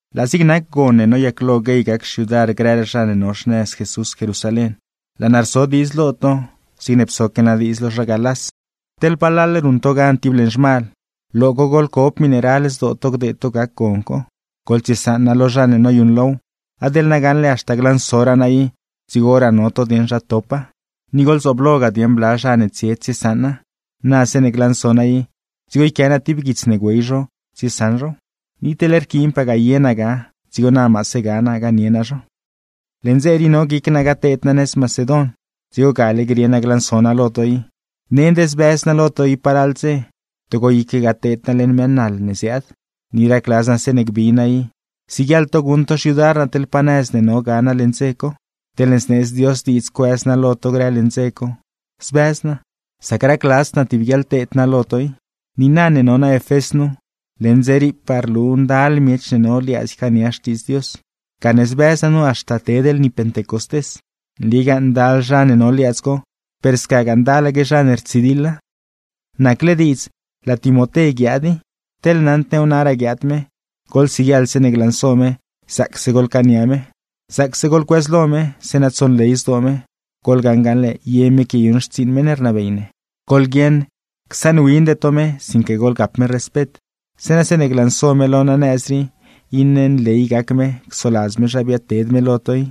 Laa zig nac gon ne noyaclo guey gac xyudar grëraa zha ne no xnëz Jesús Jerusalén, laa naa rso diidz lo to zigne psoque naa diidz lo zha Galás. Teḻ palal ruṉ to gan tib leṉ zhmal, lo co goḻcob miṉe ral zdoo to gdeed to gac gon co; gzobse dze goḻtsiesaṉa lo zha ne noyuṉlow. Adeḻ na gaṉle haxta glansoraa naa i, dzigoraa no to dieṉ zha topa. Ni goḻzoobloga dieṉ bla zha ne tsie tsiesaṉa, na zeeṉe glanso naa i dzigo yquia naa tib guits ne güey zho tsiesaṉ zhow; ni teḻ rquiinpagaa ye naa ga, dzigo na maase ga naa ganie naa zho. Leṉ dze rii no guic naa gateed naa nëz Macedon, dzigo gale grie naa glanso naa lo to i. Nend zbëz naa lo to i palal dze, togo iquegaa teed naa leṉ mëë naḻ ne ziaad; ni racladz naa zeeṉe gbi naa i, siguieḻ to guṉ to xyudar naa teḻ pa nëz ne no ga naa leṉ dze co. Teḻne zneedz Dios diidz cuëz naa lo to grë leṉ dze co, zbëz naa, sac racladzd naa tib guiaḻteed naa lo to i. Niina ne no naa Efés nu, leṉ dze riipaa rlu ndal miech ne no liaadz ycaania Xtiidz Dios, gane zbëz naa nu haxta ted lni Pentecostés. Nligaa ndal zha ne no liaadz co, per scagaa ndalaque zha ne rtsidiḻa. Nacle diidz laa Timoté guiaad i; teḻ naṉd new naraa guiaad me, goḻsiguieḻ zeeṉe glanso me zaacse goḻcaania me, zaacse goḻcuëzlo me, zeeṉa tsonley zdoo me; goḻgaṉ gaṉle, ye me quiayuṉ xtsiiṉ meṉ ne rnabey ne. Goḻguieṉ csaṉwinde to me, sinque goḻgap me respet; zeeṉa zeeṉe glanso me lo naa nëz rii iṉe nley gac me csoladz me zha biaadted me lo to i.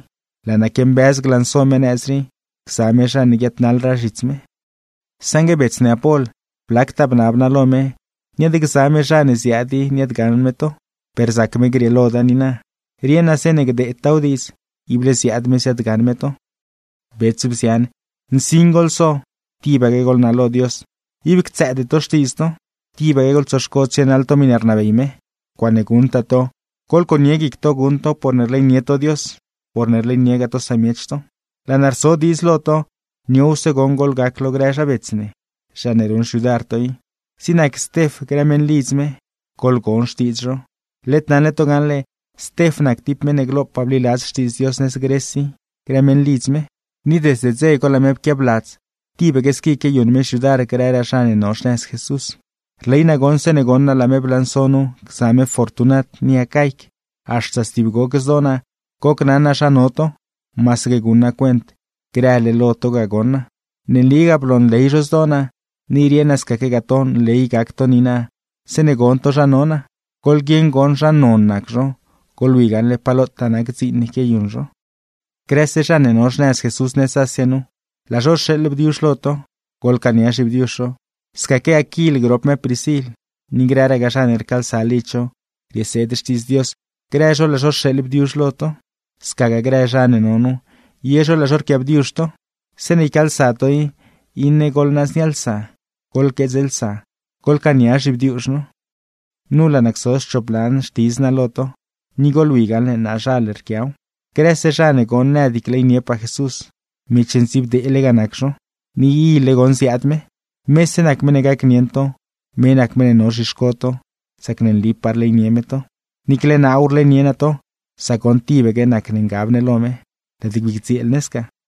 Laa naa quiambëz glanso me nëz rii, gza me zha ne guiaadnaḻraa zhits me. Saṉgue bets ne Apol, blactaa bnab naa lo me niaadgza me zha ne ziaad i niaadgaṉ me to, per rzac me grieeloda niina. Rieṉ naa zeeṉe gdeedtaaw diidz, ible ziaad me ziaadgaṉ me to. Bets, bzian, nsin goḻso, tibaque goḻnalo Dios. Ib ctsëëde to xtiidz to, tibaque goḻtsoxco tsienaḻ to miṉe rnabey me. Ncuaaṉe guṉtaa to, goḻconie guic to guṉ tow porne rleynie to Dios, porne rleyniegaa to samiech to. Laa naa rso diidz lo to, niowse goṉ goḻgac lo grë zha bets ne, zha ne ruṉ xyudar to i; zig nac Stef grë meṉlidz me, goḻgon xtiidz zho. Led naṉle to gaṉle, Stef nac tib meṉ ne glopaa bliladz Xtiidz Dios nëz Gres i grë meṉlidz me; ni desde dze co laa me pquiabladz tibaque squi quiayuṉ me xyudar grëraa zha ne no xnëz Jesús. Rley naa goṉ zeeṉe goṉ naa laa me blanso nu gza me Fortunat ni Acaic, haxta stib goc zdoo naa gocnaṉ naa zha no to, masaque guṉ naa cuent grële lo to ga goṉ naa. Ne nligaa bloonley zho zdoo naa, ni rieṉ naa scaquegaa to nley gac to niina zeeṉe gon to zha no naa. Goḻguieṉ goṉ zha non nac zho, goḻwi gaṉle pa lotaa nac dziin ne quiayuṉ zho. Grëse zha ne no xnëz Jesús nëz Asia nu, laa zho rxeeḻ bdiuzh lo to, goḻcaania zhibdiuzh zho. Scaque Aquil grop me Priscil, ni grëraa zha ne rcaalsa lidz zho rieseed Xtiidz Dios, grë zho laa zho rxeeḻ bdiuzh lo to. Scagaa grë zha ne no nu, ye zho laa zho rquiaabdiuzh to. Zeeṉe ycaalsa to i, iṉe goḻnaaznialsa, goḻqueedzlsa, goḻcaania zhibdiuzh no. Nu laa naa cso schop lan xtidz naa lo to, ni goḻwi gaṉle naazhal yquiaw: Grëse zha ne goṉ nëd gleyniepaa Jesús, miech ndziibdeele ga nac zho. ¡Ni ile goṉ ziaad me! Mese nac meṉ ne gacnieṉ to, me nac meṉ ne no zhixco to, sac ne nligaa rleynie me to. Niicle naaw rleynie naa to, sac goṉ tibaque nac ne ngab ne lo me. ¡Lëëd bii gdzieel ne sca! Pabl